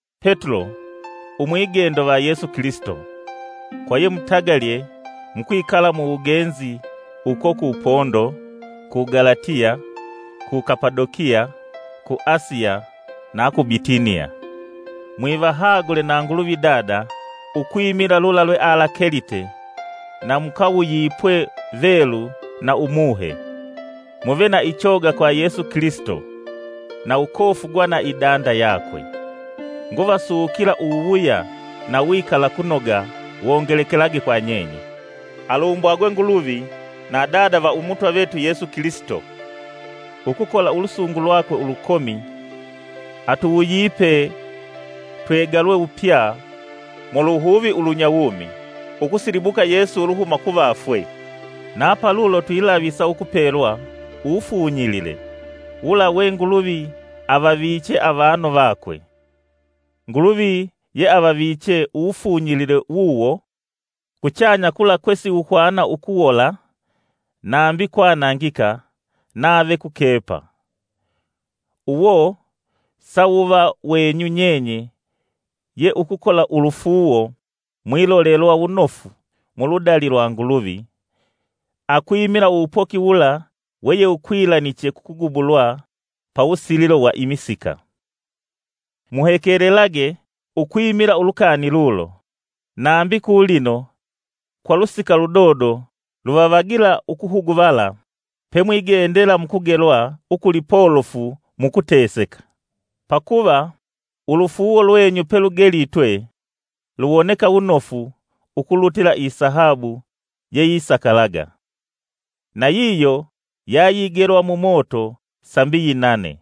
Petulo, Umwigendo va Yesu Kilisito, kwa yemutagalye, mukwikala mu wugenzi uko ku Pondo, ku Galatiya ku Kapadokiya ku Asiya na ku Bitiniya. Mwivahagule na Nguluvi Dada ukwimila lula lwealakelite, na mukawuyipwe Velu na Umuhe, muve na ichoga kwa Yesu Kilisito, na ukofugwa na idanda yakwe. Nguvasukila uwuwuya na uwikalakunoga wongelekelage kwa nyenye. Alumbwagwe Nguluvi na Dada va Umutwa vetu Yesu Kilisito! Ukukola ulusungu lwake ulukomi atuwuyipe twegalwe wupya muluhuvi ulunyawumi ukusilibukwa Yesu uluhuma kuvafwe, Na palulo twakusa upelwa uwufunyilile, wula we Nguluvi avaviche avanu vakwe. Nguluvi yeavaviche uwufunyilile wuwo kuchanya kula kwe siwuhwana ukuwola, nambi kwanangika, nave kukepa. Uwo sawuva wenyu nyenye ye ukukola ulufuuwo mwilolelwa wunofu muludali lwa Nguluvi akwimila uwupoki wula we yewukwilaniche kukugubulwa pawusililo wa imisika. Muhekelelage ukwimila ulukani lulo, nambi kulino, kwa lusika ludodo, luvavagila ukuhuguvala pemwingendela mukupelwa ukulipolofu mukuteseka. Pakuva ulufuuwo lwenyu pelugelitwe luwoneka wunofu ukulutila isahabu yeyisakalaga, nayiyo yayigelwa mumoto sambi yinane.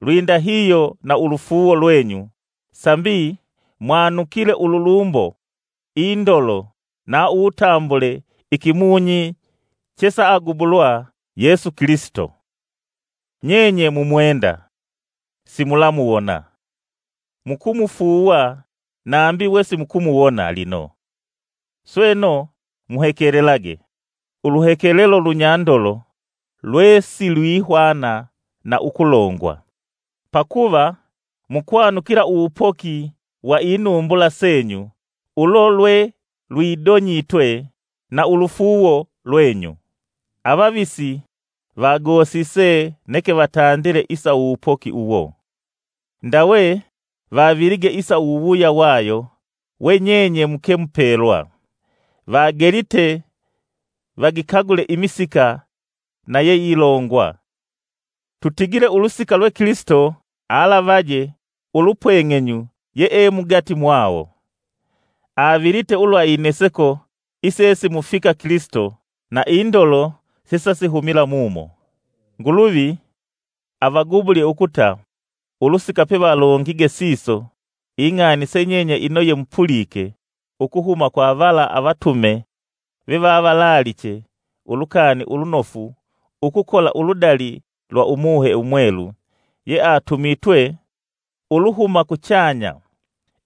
Lwindahihyo na ulufuuwo lwenyu sambi mwanukile ululumbo, indolo na uwutambule ikimunyi chesa agubulwa Yesu Kilisito. Nyenye mumwenda, simulamuwona; mukumufuuwa nambi we simukumuwona lino. Sweno, muhekelage, uluhekelelo lunyandolo lwesilwihwana na ukulongwa, pakuva mukwanukila uwupoki wa inumbula senyu ulo lwe lwidonyitwe na ulufuuwo lwenyu. Avavisi vagosise neke vatandile isa uwupoki uwo, ndawe vavilige isa uwuwuya wayo we nyenye muke mupelwa. Vagelite vagikagule imisika na yeilongwa, tutigile ulusika lwe Kilisito alavaje ulupweng'enyu yeemugati mwawo, avilite ulwa ineseko isesimufika Kilisito na indolo yesayihumila mumo. Nguluvi avagubulye ukuta ulusika pevalongige siso ing'ani se nyenye umo yemupulike ukuhuma kwa vala avatume vevavalaaliche Ulukani Ulunofu ukukola uludali lwa Umuhe Umwelu yeatumitwe uluhuma kuchanya,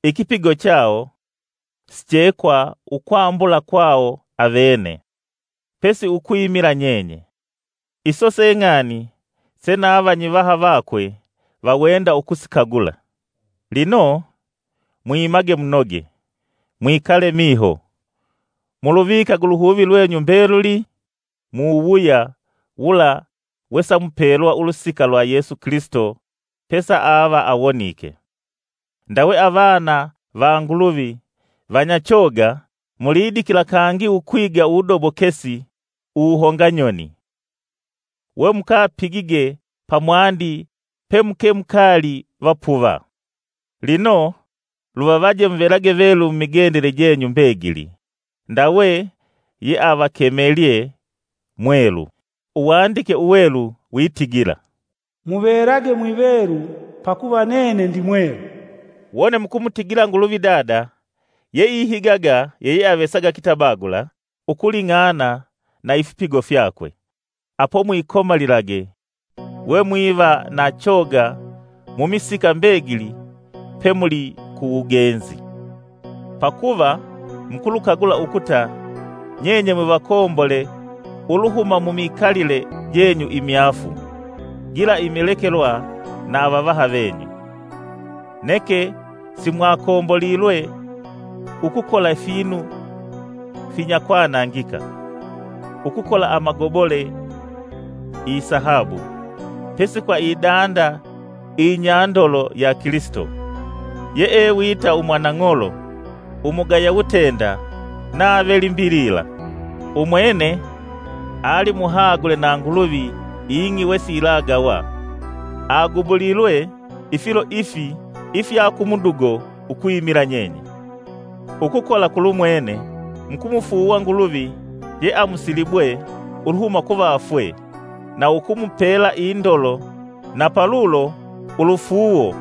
ikipigo chawo siche kwa ukwambula kwawo avene, pesi ukwimila nyenye. Iso se ng'ani se na vanyivaha vake vawenda ukusikagula. Lino, mwimage munoge, mwikale miho, muluvikage uluhuvi lwenyu mbeluli mu wuwuya wula wesamupelwa ulusika lwa Yesu Kilisito pesaava awonike! Ndawe avana va Nguluvi vanyachoga mulidikila kangi ukwiga uwudobokesi uwuhonganyoni, wemukapigige pamwandi pemuke mukaali vapuva! Lino luvavaje muvelage velu mumigendele jenyu mbegili, ndawe yeavakemelye. Mwelu. Uwandike Uwelu witigila, “Muvelage mwivelu, pakuva nene ndi mwelu.” Wone mukumutigila Nguluvi Dada yeihigaga yeyeavesaga kitabagula ukuling'ana na ifipigo fyakwe, apo mwikomalilage we mwiva na choga mumisika mbegili pemuli ku wugenzi. Pakuva mukulukagula ukuta nyenye mwivakombole uluhuma mumikalile jenyu imyaafu gila imilekelwa na avavaha venyu. Neke simwakombolilwe ukukola ifinu finyakwanangika: ukukola amagobole, isahabu, pesi kwa idanda iyinyandolo ya Kilisito, yee wita umwanang'olo umugaya wutenda nave limbilila. Umwene alimuhagule na Nguluvi ing'i wesiyilagawa, agubulilwe ifilo ifi ifya ukumudugo ukwimila nyenye. Ukukola kulumwene, mukumufuuwa Nguluvi yeamusilibwe uluhuma kuvafwe na ukumupela indolo na palulo ulufuuwo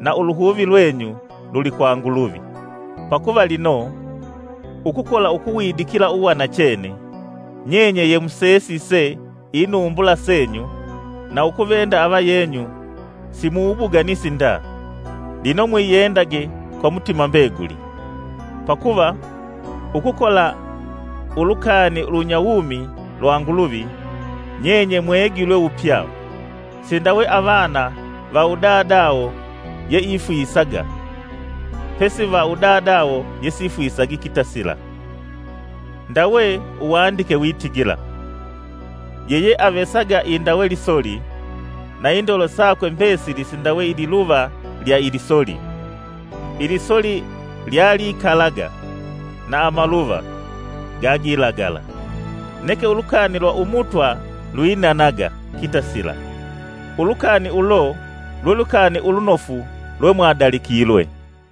na uluhuvi lwenyu luli kwa Nguluvi. Pakuva lino, ukukola ukuwidikila uwanachene, nyenye yemusesise inumbula senyu na ukuvenda avayenyu si muwubuganisi nda, lino mwiyendage kwa mutima mbeguli. Pakuva ukukola ulukani ulunyawumi lwa Nguluvi, nyenye mwegilwe wupya, sindawe avana va udadawo yeifwisaga, pesi va udadawo yesifwisagi kitasila. Ndawe Uwandike witigila; “Yeyeavesaga indawe lisoli, na indolo sakwe mbesili sindawe ililuva lya ilisoli. Ilisoli lyalikalaga na amaluva, gagilagala. Neke Ulukani lwa Umutwa lwinanaga kitasila.” Ulukani ulo lwe Lukani ulunofu lwemwadalikilwe.